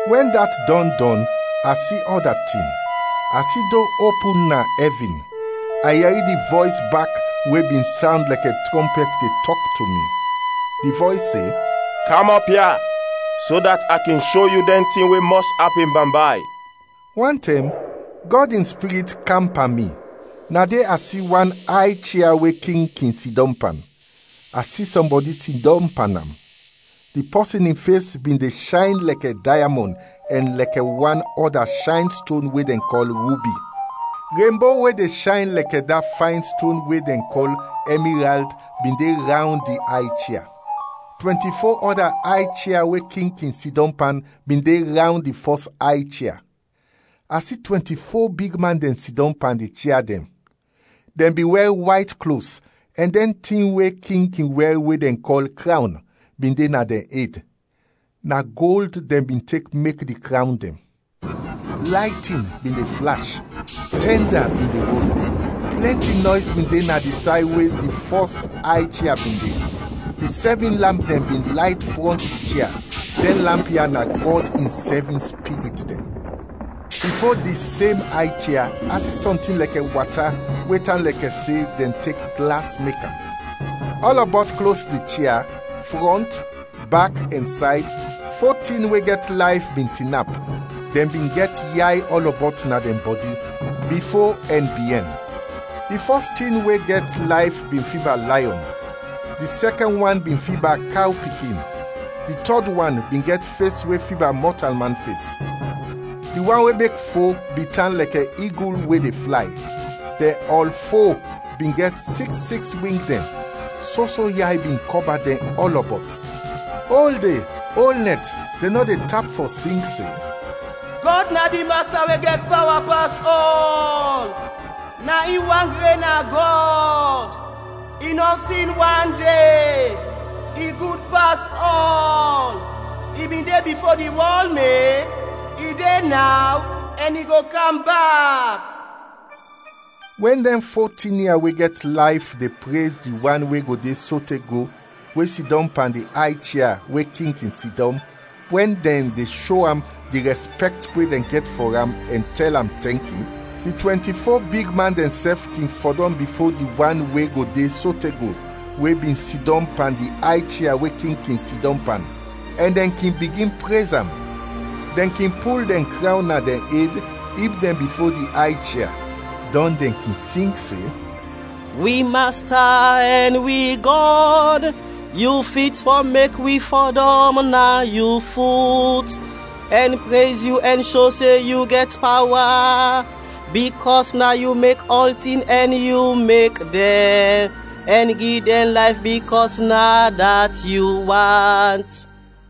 Wɛn dat dɔn dɔn a si ɔda tin; a si do opin na ɛvin: a yɛri di vɔys bak we bin sawnd lɛkɛ trɔmpɛt de tɔk to mi. Di vɔys se, “Kam ɔp ya, so dat a kin sho yu dɛn tin we mɔs apin bambay.” Wantɛm, Gɔd in Spirit kam pan mi; na de a si wan ay chia we king kin sidɔm pan, a si sɔmbɔdi sidɔm pan am. Di pɔsin in fes bin de shayn lɛkɛ dayamɔn ɛn lɛkɛ wan ɔda shayn ston we dɛn kɔl rubi. Renbo we de shayn lɛkɛ da fayn ston we dɛn kɔl ɛmirald bin de rawnd di ay chia. Twɛnti-fo ɔda ay chia we king kin sidɔm pan bin de rawnd di fɔs ay chia; a si twɛnti-fo bigman dɛn sidɔm pan di chia dɛn; dɛn bin wɛr wayt klos; ɛn dɛn tin we king kin wɛr we dɛn kɔl krawn, bin de na dɛn ed, na gold dɛn bin tek mek di krawn dɛn. Laytin bin de flash, tɛnda bin de rol, plɛnti nɔys bin de na di say we di fɔs ay chia bin de, di sɛvin lamp dɛn bin layt frɔnt di chia, dɛn lamp ya na Gɔd in sɛvin spirit dɛn. Bifo di sem ay chia a si sɔntin lɛkɛ wata we tan lɛkɛ se dɛn tek glas mek am. Ɔlɔbɔt klos di chia, frɔnt, bak ɛn sayd, fo tin we gɛt layf bin tinap, dɛn bin gɛt yay ɔlɔbɔt na dɛn bɔdi; bifo ɛn biɛn. Di fɔs tin we gɛt layf bin fiba layɔn, di sɛkɛn wan bin fiba kaw pikin, di tɔd wan bin gɛt fes we fiba mɔtalman fes, di wan we mek fo bin tan lɛkɛ igul we de flay. Dɛn ɔl fo bin gɛt siks siks wing dɛn; soso yay bin kɔba dɛn ɔlɔbɔt. Ol de ol nɛt dɛn nɔ de tap fɔ sing se, “Gɔd na di Masta we gɛt pawa pas ɔl, na in wan gren na Gɔd, i nɔ sin wande, i gud pas ɔl. I bin de bifo di wɔl mek, i de naw ɛn i go kam bak.” Wɛn dɛn fo tin ya we gɛt layf de prez di wan we go de sote go, we sidɔm pan di ay chia we king kin sidɔm, wɛn dɛn de sho am di rɛspɛkt we dɛn gɛt fɔ am ɛn tɛl am tɛnki, di twɛnti-fo bigman dɛnsɛf kin fɔdɔm bifo di wan we go de sote go, we bin sidɔm pan di ay chia we king kin sidɔm pan, ɛn dɛn kin bigin prez am; dɛn kin pul dɛn krawn na dɛn ed ib dɛn bifo di ay chia; dɔn dɛn kin sing se, “Wi Masta ɛn wi Gɔd! Yu fit fɔ mek wi fɔdɔm na yu fut, ɛn prez yu, ɛn sho se yu gɛt pawa, bikɔs na yu mek ɔltin ɛn yu mek dɛn ɛn gi dɛn layf bikɔs na dat yu want.”